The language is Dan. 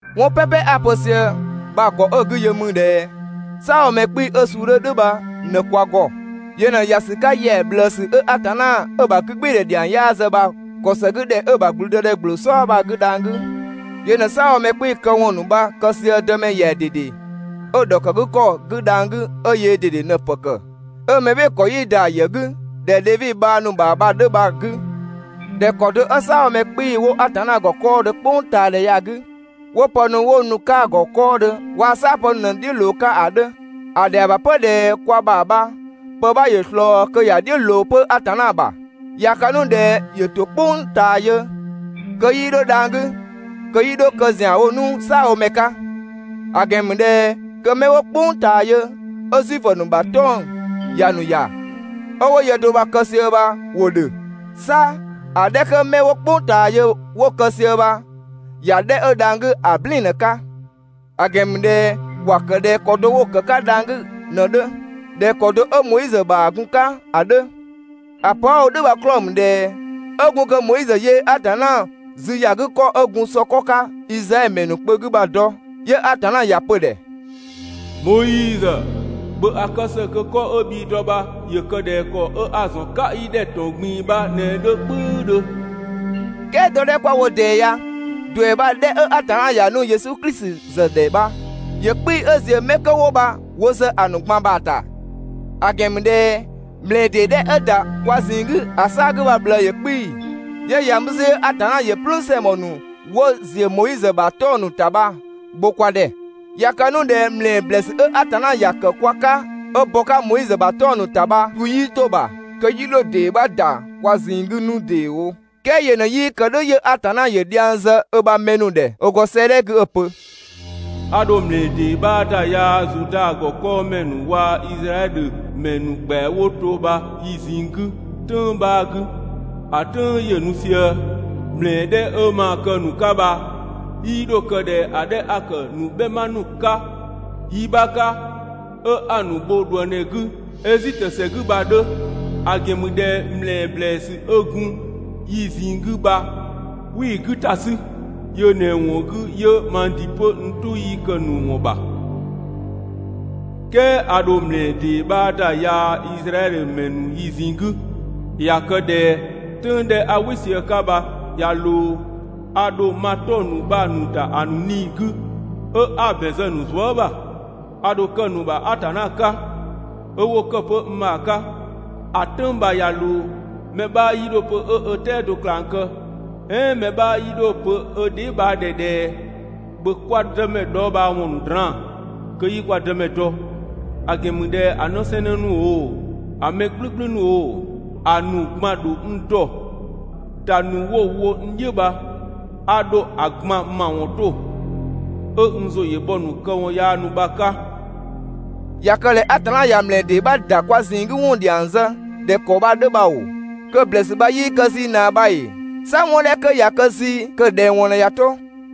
'Wɔn "pɛpɛ 'a‑ pö sië bha‑ ‑gɔ 'ö‑ 'gü yö ‑mü ꞊dhɛ "saabhomɛ 'kpii‑ 'ö‑ suu 'dhö "dhʋ̈ bha ꞊në kwa ‑gɔ. Yö ꞊në ‑ya ‑sü 'ka ‑yɛa ꞊bhlëësü ö Atanna 'ö‑ ‑bha 'gügbɩɩdhɛ ‑dhiang 'yaa zë bha‑ ‑kɔ ‑së 'gü ‑dhɛ 'ö‑ ‑bha ‑gblüdëdhɛ ‑gbloo "sɔɔ bha‑ 'gü dhang‑ 'gü. Yö ꞊në "saabhomɛ 'kpii‑ këwɔn ‑nu bha‑ kë sië Dëmɛ ‑yɛa ꞊dede 'ö‑ ‑dhɔkëgükɔ 'gü dhang‑ 'gü 'ö yöö ꞊dede ꞊në‑ ‑pë ‑kë, 'ö mɛ "bhɩɩ‑ ‑kɔ 'yii ‑da ‑a ‑yë 'gü ꞊dhɛ Dhevi bhang ‑nu ‑bha bha‑ 'dhö bha‑ 'gü. ꞊Dhɛ ‑kɔ do 'ö "saabhomɛ 'kpii‑ 'wo Atanna ‑gɔ 'kɔɔdhö "kpʋngtaadhɛ ya‑ 'gü, 'wo pë ‑nu 'wo nu‑ 'ka‑ ‑gɔ 'kɔɔdhö waa‑ "saapë ‑nu ꞊në "dhiʋ̈ ꞊loo‑ 'ka ‑a 'dhö, ‑a ‑dhɛa ‑bha 'pö ꞊dhɛ kwa ‑bha bha pë 'bha ‑yö ꞊slɔɔ kö ‑ya "dhiʋ̈ ꞊loo 'pö Atanna ‑bha. ꞊Ya kë 'nu ꞊dhɛ ‑yö ‑to "kpʋng ꞊taa yö kö 'yii 'dho dhang‑ 'gü, kö 'yii 'dho kë ‑zianwo 'nu "saabhomɛ 'ka. ‑A ‑gɛn ‑mü ꞊dhɛ kö mɛ 'wo "kpʋng ꞊taa yö 'ö Zuifö ‑nu ‑bha 'tɔng‑ ‑ya ‑nu ‑ya, 'ö 'wo yë do bha‑ kë sië bha ‑wo ‑dhö. 'Sa ‑a 'dhɛ 'kö 'mɛ 'wo "kpʋng ꞊taa yö 'wo‑ kë sië bha ‑ya 'dhɛ 'ö dhang‑ 'gü ‑a "blɛɛn‑ ꞊në‑ 'ka. ‑A ‑gɛn ‑mü ꞊dhɛ ‑wa ‑kë ꞊dhɛ ‑kɔ do 'wo‑ ‑kë 'ka dhang‑ 'gü ꞊në‑ 'dhö ꞊dhɛ ‑kɔ do 'ö Moizö ‑bha gun‑ 'ka ‑a 'dhö. ‑A pö 'a‑ wo "dhʋ̈ bha‑ 'klɔɔ‑ ‑mü ꞊dhɛ 'ö gun kö Moizö yöö Atanna zü ‑ya 'gü ‑kɔ 'ö gun sɔ 'kɔ 'ka Izraɛdhö ‑mɛ ‑nu kpö 'gü bha‑ dɔ, 'yö Atanna ‑ya pö‑ ‑dhɛ: «Moizö, ‑bhö ‑a kë ‑së kö 'kɔ 'ö bhii‑ dɔ bha ‑yö kë ꞊dhɛ ‑kɔ 'a‑ ‑zɔn 'ka i ‑dhɛ ‑tɔn ꞊gbin‑ bha ꞊në‑ 'dhö "kpʋ̈üdhö.» "Kɛɛ dɔ 'dhɛ 'kwa‑ wo ꞊dɛɛ ya, ‑duɛ bha‑ 'dhɛ 'ö Atanna ‑ya nu Yesu Klisi ‑zë ‑dhɛ bha ‑yö 'kpii‑ 'ö ‑ziö 'mɛ kö 'wo bha wo ‑zë ‑a ‑nu ꞊gban ‑bha ‑ta. ‑A ‑gɛn ‑mü ꞊dhɛ ‑mlɛɛ ‑dee 'dhɛ 'ö‑ ‑da kwa ꞊zinng 'gü ‑a 'saa‑ 'gü bha‑ ꞊bhlëë ‑yö 'kpii‑, 'yö ‑ya mü 'zü 'yö Atanna ‑yö "plüün ‑sɛngbɔ ‑nu 'wo ‑ziö Moizö ‑bha 'tɔng‑ ‑nu ‑ta bha‑ bho kwa ‑dhɛ. ꞊Ya kë 'nu ꞊dhɛ ‑mlɛɛ ‑blɛɛsü 'ö Atanna ‑ya ‑kë kwa 'ka 'ö bɔ‑ 'ka Moizö ‑bha 'tɔng‑ ‑nu ‑ta bha‑ du 'yii 'to‑ ‑bha, kö 'yii 'dho‑ ‑dee 'bha ‑da kwa ꞊zinng 'gü 'nu ‑deewo. "Kɛɛ yö ꞊në 'yii kë "dhʋ̈ 'yö Atanna ‑yö dhiang zë ö ‑bha mɛ ‑nu ‑dhɛ 'ö ‑gɔ 'sëëdhɛ 'gü 'ö‑ pö: «A ‑dho ‑mlɛɛ ‑dee 'bha ‑da yaa Zuda ‑gɔ 'kɔɔmɛ ‑nu waa‑ Izraɛdhö ‑mɛ ‑nu ‑kpɛa 'wo to bha yi ꞊zinng 'gü "tʋ̈ng 'bha 'gü, ‑a "tʋ̈ng ‑yö nu sië. ‑Mlɛɛ 'dhɛ 'ö maa‑ kë‑ ‑nu 'ka bha 'yii 'dho kë ꞊dhɛ ‑a 'dhɛ 'a‑ ‑kë ‑nu "bhɛma ‑nu 'ka yi 'bha 'ka, 'ö 'a‑ ‑nu bho ꞊dhuëngdhɛ 'gü Ezitö ‑sɛ 'gü bha‑ 'dhö. ‑A ‑gɛn ‑mü ꞊dhɛ ‑mlɛɛ ‑blɛɛsü 'ö gun yi ꞊zinng 'gü bha, 'wii‑ 'gü ‑ta 'sü. Yö ꞊në‑ ‑wɔn 'gü 'yö mang ‑dɩ 'pö n "tʋ 'yii kë‑ ‑nu ‑wɔn ‑bha. "Kɛɛ a ‑dho ‑mlɛɛ ‑dee 'bha ‑da yaa Izraɛdhö ‑mɛ ‑nu yi ꞊zinng 'gü. ꞊Ya kë ꞊dhɛ "tʋ̈ng 'dhɛ 'a "wɩ sië‑ 'ka bha ꞊ya ꞊loo, a ‑dho ma 'tɔng‑ ‑nu bha‑ ‑nu ‑da ‑a ‑nu 'nii‑ 'gü, 'ö 'a‑ ‑bɛn zë‑ ‑nu zuë" ‑bha. A ‑dho kë‑ ‑nu ‑bha Atanna 'ka, 'ö 'wo ‑kë 'pö n ‑bha 'ka. ‑A "tʋ̈ng bha ꞊ya ꞊loo, mɛ 'bha 'yii 'dho‑ pö 'ö ö "tɛado ꞊klang kë, "ɛɛn mɛ 'bha 'yii 'dho‑ pö ö dheebhang ‑dhɛ ꞊dhɛ: ‹‑Bhö kwa Dëmɛ dhɔɔbhaawɔn ‑nu draan‑ kö 'i kwa Dëmɛ dɔ›; ‑A ‑gɛn ‑mü ꞊dhɛ ‑a 'në 'sɛɛnnë ‑nu oo, ‑a ‑mɛ "gblʋ̈gblʋ̈ ‑nu oo, ‑a ‑nu ꞊gban ‑dho n dɔ. ‑Da ‑nu 'wo‑ wo n "dhiʋ̈ bha, a ‑dho ‑a ꞊gban ‑mawɔn 'to, 'ö n ‑zʋ ‑yö bhɔ‑ ‑nu këwɔn yaa ‑nu bha‑ 'ka.» ꞊Ya kë ꞊dhɛ Atanna ꞊ya ‑mlɛɛ ‑dee 'bha ‑da kwa ꞊zinng 'gü ‑wɔn ‑dhiang zë ꞊dhɛ ‑kɔ bha‑ 'dhö bha ‑oo, kö‑ ‑blɛɛsü bha 'yii kë zii ꞊naa bha ‑ee? 'Sa 'wɔn 'dhɛ 'kö ꞊ya kë zii kö‑ ꞊dhɛng ‑wɔn ꞊në ꞊ya 'to.